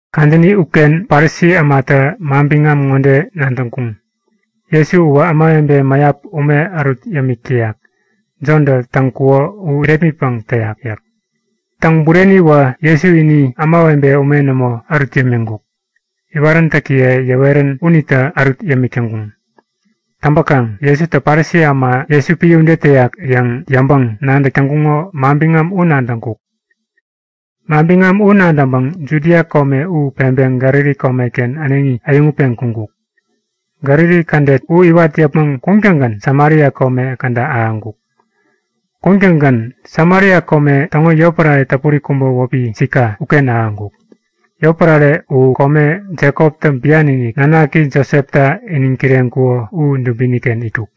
Kadäni uken Parisi ämatä manbiŋam ŋode nadäŋkuŋ; Jesu uwä ämawebe mäyap ume ärut yämik täyak, Jontä täk täŋkuko u irepmitpäŋ täyak. (Täŋ bureni uwä Jesu ini ämawebe ume nämo ärut yämiŋkuk. Iwaräntäkiye yäwerän unitä ärut yämik täŋkuŋ.) Täŋpäkaŋ Jesutä Parisi äma Jesu epän ude täyak yäŋ yäŋpäŋ-nadäk täŋkuŋo manbiŋam u nadäŋkuk. Manbiŋam u nadäŋpäŋ Judia kome u peŋpeŋ Galili komeken äneŋi äyäŋutpeŋ kuŋkuk. Galili kädet u iwat yäpmäŋ kuŋtäŋgän Samaria kome käda ahäŋkuk. Kuŋtäŋgän Samaria kome täŋo yotpärare täpuri kubä wäpi Sika uken ahäŋkuk. (Yotpärare u kome Jekoptä bian-inik nanaki Josepta iniŋ kireŋkuko u dubini-ken itkuk.)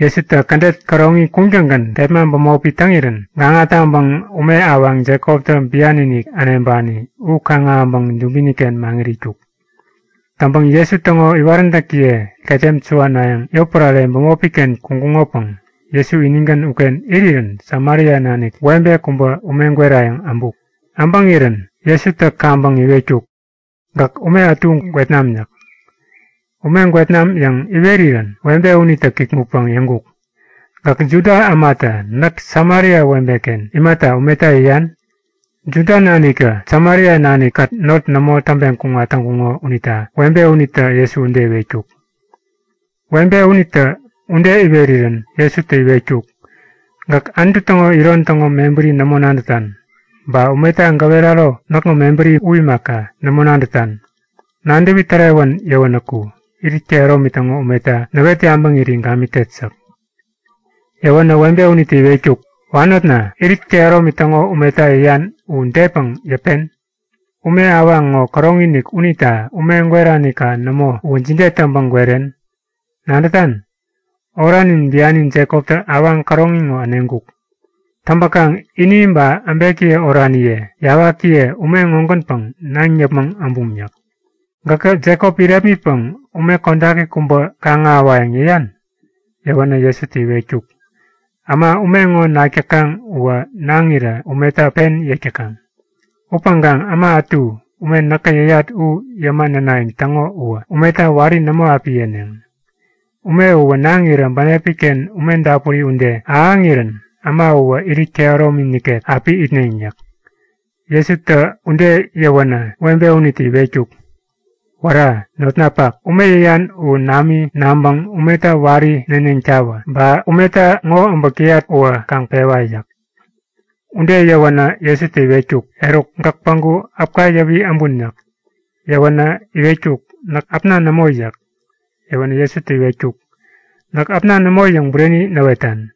Jesutä kädet käroŋi kuŋtäŋgän kepma bämopi täŋirän gaŋa taŋpäŋ ume awaŋ Jekoptä bian-inik äneŋpani u kaŋ-ahäŋpäŋ dubini-ken maŋit itkuk. Täŋpäŋ Jesu täŋo iwaräntäkiye ketem suwanayäŋ yotpärare bämopi-ken kuŋkuŋopäŋ Jesu inigän uken irirän Samaria nanik webe kubä ume gwerayäŋ äbuk. Äbäŋirän Jesutä kaŋpäŋ iwetkuk; Gäk ume ätu gwet nam yäk. Ume gwet nam yäŋ iwerirän webe unitä kikŋutpäŋ yäŋkuk; Gäk Juda ämatä näk Samaria webeken imata umeta yäyan? (Juda naniktä Samaria nanikkät not nämo täŋpeŋ kuŋat täŋkuŋo unita webe unitä Jesu ude iwetkuk.) Webe unitä ude iwerirän Jesutä iwetkuk; Gäk Anutu täŋo iron täŋo mebäri nämo nadätan, ba umeta gäweraro näkŋo mebäri u imaka, nämo nadätan. Nadäwi tärewän yäwänäku, irit kehäromi täŋo umeta näwet yabäŋiri gamitet yäk. Yäwänä webe unitä iwetkuk; Wanotna, irit kehäromi täŋo umeta yäyan u depäŋ yäpen? Ume awaŋ ŋo käroŋi-inik unita ume gweranika nämo uwä jide täŋpäŋ gweren? Nadätan? Oranin biani Jekoptä awaŋ käroŋi ŋo äneŋkuk. Täŋpäkaŋ ini ba äbekiye oraniye, yawakiye ume ŋogänpäŋ naŋ yäpmäŋ äbuŋ yäk. Gäkä Jekop irepmitpäŋ ume kodaki kubä kaŋ-ahäwayäŋ yäyan? Yäwänä Jesutä iwetkuk; Äma ume ŋo nak täkaŋ uwä naŋirä umeta pen yek täkaŋ. Upäŋkaŋ äma ätu ume näkä yäyat u yäma nänayäŋ täŋo uwä umeta wari nämo api yeneŋ. Ume uwä naŋirä bänepi-ken ume dapuri ude ahäŋirän äma uwä irit kehäromi nikek api itneŋ yäk. Jesutä ude yäwänä webe unitä iwetkuk; Wära! Notnapak, ume yäyan u nami naŋpäŋ umeta wari neneŋtawä! Ba umeta ŋo äbäk täyat uwä kaŋ pewa! yäk. Ude yäwänä Jesutä iwetkuk; Eruk, gäk päŋku äpka yäwi äbun yäk. Yäwänä iwetkuk; Näk äpna nämo yäk. Yäwänä Jesutä iwetkuk; Näk äpna nämo yäŋ bureni näwetan.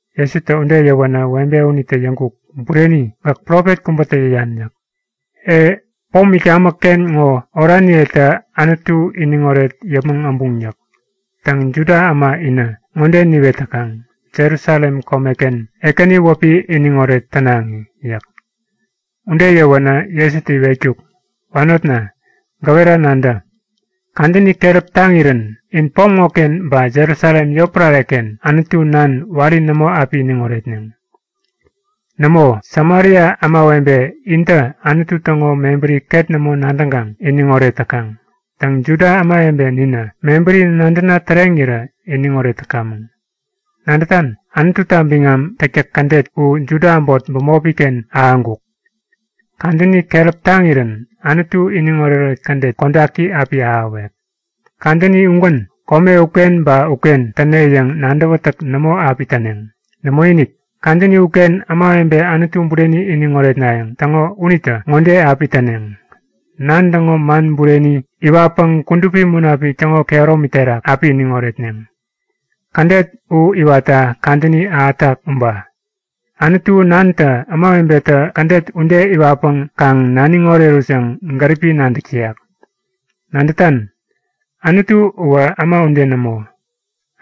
Jesutä ude yäwänä webe unitä yäŋkuk; Bureni! Gäk profet kubätä yäyan yäk. E, pom itkamäk-ken ŋo oraniyetä Anutu iniŋoret yäpmäŋ äbuŋ yäk. Täŋ, Juda äma inä ŋode niwet täkaŋ; Jerusalem komeken Ekäni wäpi iniŋoret tänaŋi yäk. Ude yäwänä Jesutä iwetkuk; Wanotna, gäwera nadä. Kadäni keräp taŋirän in pom ŋoken ba Jerusalem yotpärare-ken Anutu Nan wari nämo api iniŋ oretneŋ. Nämo, Samaria ämawebe intä Anutu täŋo mebäri ket nämo nadäŋkaŋ iniŋoret täkaŋ. Täŋ, Juda ämawebe ninä mebäri nadäna täreŋirä iniŋoret täkamäŋ. Nadätan? Anututa biŋam täktäk kädet u Juda äbot bämopi-ken ahäŋkuk. Kadäni keräp taŋirän Anutu iniŋoret-oret kädet kodaki api ahäwek. Kadäni ugän kome uken ba uken täne yäŋ nadäwätäk nämo api täneŋ. Nämoinik! Kadäni uken ämawebe Anutu bureni iniŋ oretnayäŋ täŋo unitä ŋode api täneŋ; Nan täŋo man bureni iwatpäŋ Kudupi Munapik täŋo kehäromi terak api iniŋ oretneŋ. Kädet u iwatta kadäni ahätak uba. Anutu Nantä ämawebetä kädet ude iwatpäŋ kaŋ naniŋ orerut yäŋ gäripi nadäk täyak. Nadätan? Anutu uwä äma ude nämo.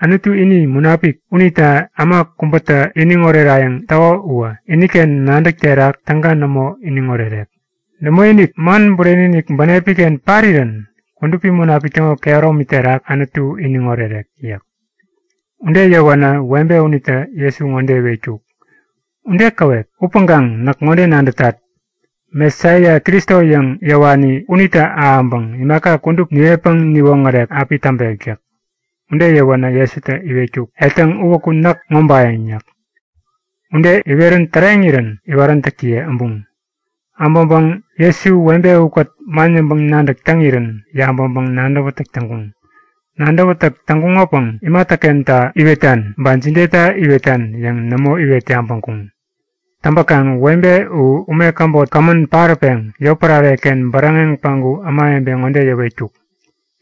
Anutu ini munapik unita äma kubätä iniŋ orerayäŋ täko uwä iniken nadäk terak täga nämo iniŋ orerek. Nämoinik, man bureni-inik bänepi-ken parirän Kudupi Munapik täŋo kehäromi terak Anutu iniŋ orerek yäk. Ude yäwänä webe unitä Jesu ŋode iwetkuk; Ude käwep. Upäŋkaŋ näk ŋode nadätat; Mesaia, Kristo yäŋ yäwani unitä ahäŋpäŋ imaka kudup niwetpäŋ niwoŋärek api täŋpek yäk. Ude yäwänä Jesutä iwetkuk; Etäŋ, uwäku näk ŋobayäŋ yäk. Ude iwerän täreŋirän iwaräntäkiye äbuŋ. Äbäŋpäŋ Jesu webe ukät man yäŋpäŋ-nadäk täŋirän yabäŋpäŋ-nadäwätäk täŋkuŋ. Nadäwätäk täŋkuŋopäŋ imatäkenta iwetan, ba jideta iwetan yäŋ nämo iwet yabäŋkuŋ. Täŋpäkaŋ webe u ume käbot kämän paräpeŋ yotpärare-ken bäräŋeŋ päŋku ämawebe ŋode yäwetkuk;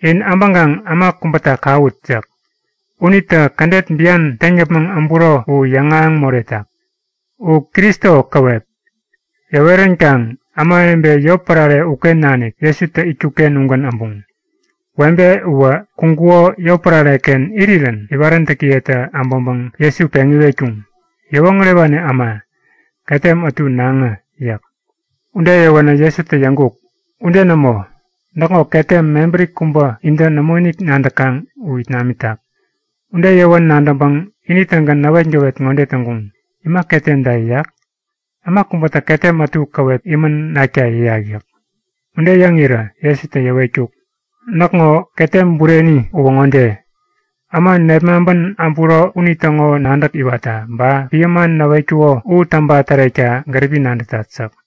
In äbäŋkaŋ äma kubäta kawut! yäk. Unitä kädet bian täŋ yäpmäŋ äburo u yäŋahäŋ moretak. U Kristo käwep! Yäweränkaŋ ämawebe yotpärare uken nanik Jesutä itkuk-ken ugän äbuŋ. Webe uwä kuŋkuko yotpärare-ken irirän iwaräntäkiyetä äbäŋpäŋ Jesu peŋ iwetkuŋ; Yäwoŋärewani äma, ketem ätu näŋä! yäk. Ude yäwäwä Jesutä yäŋkuk; Ude nämo! Näkŋo ketem mebäri kubä intä nämoinik nadäkaŋ u it namitak. Ude yäwän nadäŋpäŋ ini-tägän näwetgäwet ŋode täŋkuŋ; Ima ketemta yäyak? Äma kubätä ketem ätu käwep imän nakta yäyak yäk. Ude yäŋirä Jesutä yäwetkuk; Näkŋo ketem bureni uwä ŋode; Äma nepmaŋpän äpuro unitäŋo nadäk iwatta, ba epän man näwetkuko u täŋpa tärekta gäripi nadätat yäk.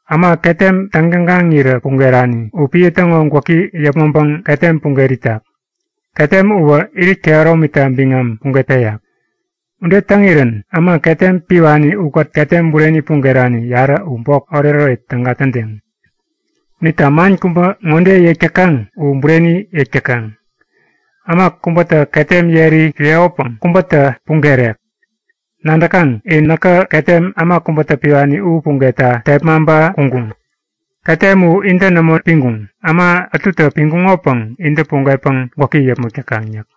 Äma ketem täŋ-tägaŋirä pugerani u epän täŋo gwäki yäpmäŋpäŋ ketem puget itak. Ketem uwä irit kehäromita biŋam puget peyak. Ude täŋirän äma ketem piwani ukät ketem bureni pugerani yarä u bok oretoret täga tädeŋ. Unita man kubä ŋode yäk täkaŋ u bureni yäk täkaŋ; Äma kubätä ketem yeri piwekopäŋ kubätä pugerek. Nadäkaŋ? In näkä ketem äma kubätä piwani u pugetta tepmaŋpa kuŋkuŋ. Ketem u intä nämo piŋkuŋ. Äma ätutä piŋkuŋopäŋ intä pugetpäŋ gwäki yäpmäk täkaŋ yäk.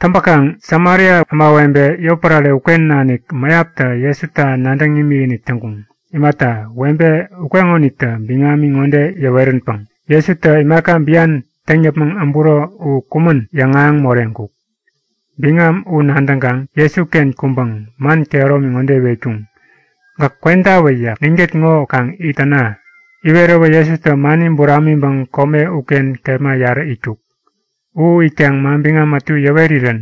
Täŋpäkaŋ Samaria ämawebe yotpärare uken nanik mäyaptä Jesuta nadäŋ imikinik täŋkuŋ. Imata, webe ukeŋonitä biŋami ŋode yäweränpäŋ; Jesutä imaka bian täŋ yäpmäŋ äburo u kumän yäŋahäŋ moreŋkuk. Biŋam u nadäŋkaŋ Jesuken kuŋpäŋ man kehäromi ŋode iwetkuŋ; Gäk kwentawä yäk. Ninkät ŋo kaŋ it täna. Iweräwä Jesutä mani buramiŋpäŋ kome uken kepma yarä itkuk. U itkaŋ manbiŋam ätu yäwerirän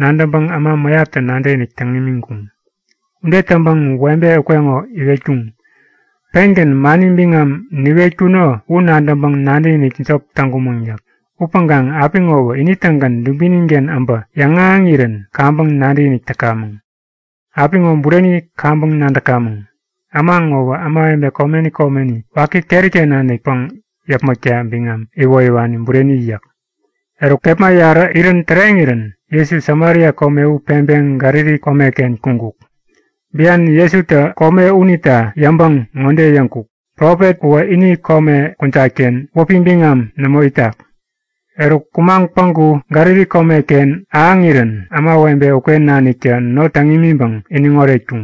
nadäŋpäŋ äma mäyaptä nadäkinik täŋ imiŋkuŋ. Ude täŋpäŋ webe ukeŋo iwetkuŋ; Pengän mani biŋam niwetkuno u nadäŋpäŋ nadäkinik jop täŋkumäŋ yäk. Upäŋkaŋ apiŋowä ini-tägän dubinin-ken äbä yäŋahäŋirän kaŋpäŋ nadäkinik täkamäŋ. Apiŋo bureni kaŋpäŋ nadäkamäŋ; Äma ŋowä ämawebe komeni komeni waki keri-ken nanikpäŋ yäpmäkta biŋam iwoyäwani bureni yäk. Eruk kepma yarä irän täreŋirän Jesu Samaria kome u peŋpeŋ Galili komeken kuŋkuk. (Bian Jesutä ini kome unita yäŋpäŋ ŋode yäŋkuk; Profet uwä ini kome kujat-ken wäpi biŋam nämo itak.) Eruk, kumaŋ päŋku Galili komeken ähäŋirän ämawebe uken naniktä not täŋ imiŋpäŋ iniŋ oretkuŋ.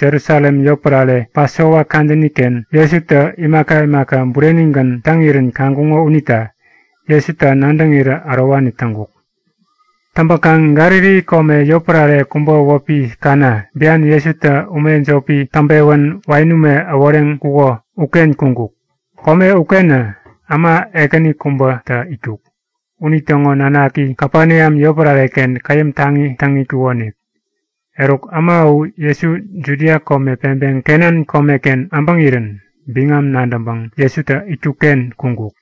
Jerusalem yotpärare, Pasova kadäni-ken Jesutä imaka imaka burenigän täŋirän kaŋkuŋo unita Jesuta nadäŋirä ärowani täŋkuk. Täŋpäkaŋ Galili kome yotpärare kubä wäpi Kana, bian Jesutä ume jopi täŋpewän wain ume äworeŋkuko uken kuŋkuk. Kome ukenä äma ekäni kubätä itkuk. Unitäŋo nanaki Kapeneam yotpärare-ken käyäm taŋi täŋ itkukonik. Eruk, äma u Jesu Judia kome peŋpeŋ Galili komeken äbäŋirän biŋam nadäŋpäŋ Jesutä itkuk-ken kuŋkuk.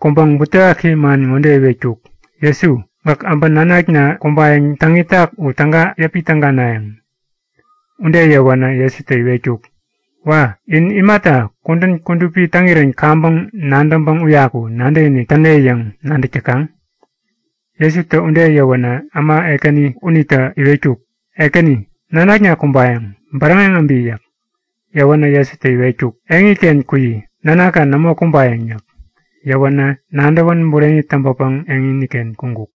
Kuŋpäŋ butewaki man ŋode iwetkuk; Jesu, gäk äbä nanakna kumbayäŋ täŋ itak u täga yäpi täganayäŋ? Ude yäwänä Jesutä iwetkuk; Wa! In imata kudän kudupi täŋirän kaŋpäŋ nadäŋpäŋ uyaku nadäkinik täne yäŋ nadäk täkaŋ? Jesutä ude yäwänä äma ekäni unitä iwetkuk; Ekäni, nanakna kumbayäŋ. Bäräŋeŋ äbi! yäk. Yäwänä Jesutä iwetkuk; Eŋiken kuyi. Nanakka nämo kumbayäŋ yäk. Yäwänä nadäwän bureni täŋpäpäŋ eŋini-ken kuŋkuk.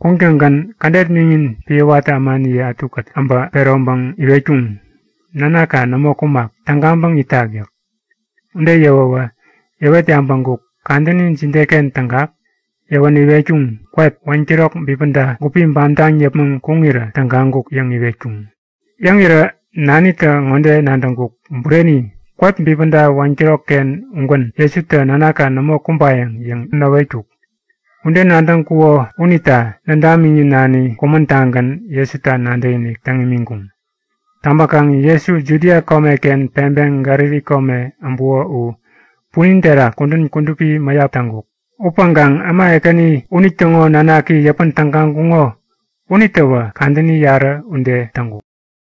Kuŋtäŋgän kädet miŋin epän watä ämaniye ätukät äbä peroŋpäŋ iwetkuŋ; Nanakka nämo kumak. Tägaŋpäŋ itak yäk. Ude yäwäwä yäwet yabäŋkuk; Kadäni jideken tägak? Yäwänä iwetkuŋ; Kwep, 1'kirok bipäda gupi bamtaŋ yäpmäŋ kuŋirä tägaŋkuk yäŋ iwetkuŋ. Yäŋirä nanitä ŋode nadäŋkuk; Bureni! Kwep bipäda 1'kirokken ugän Jesutä Nanakka nämo kumbayäŋ yäŋ näwetkuk. Ude nadäŋkuko unita nädamiŋi-nani kumän-tagän Jesuta nadäkinik täŋ imiŋkuŋ. Täŋpäkaŋ Jesu Judia komeken peŋpeŋ Galili kome äbuko u punin terak kudän kudupi mäyap täŋkuk. Upäŋkaŋ äma ekäni unitäŋo nanaki yäpän tägaŋkuŋo unitäwä kadäni yarä ude täŋkuk.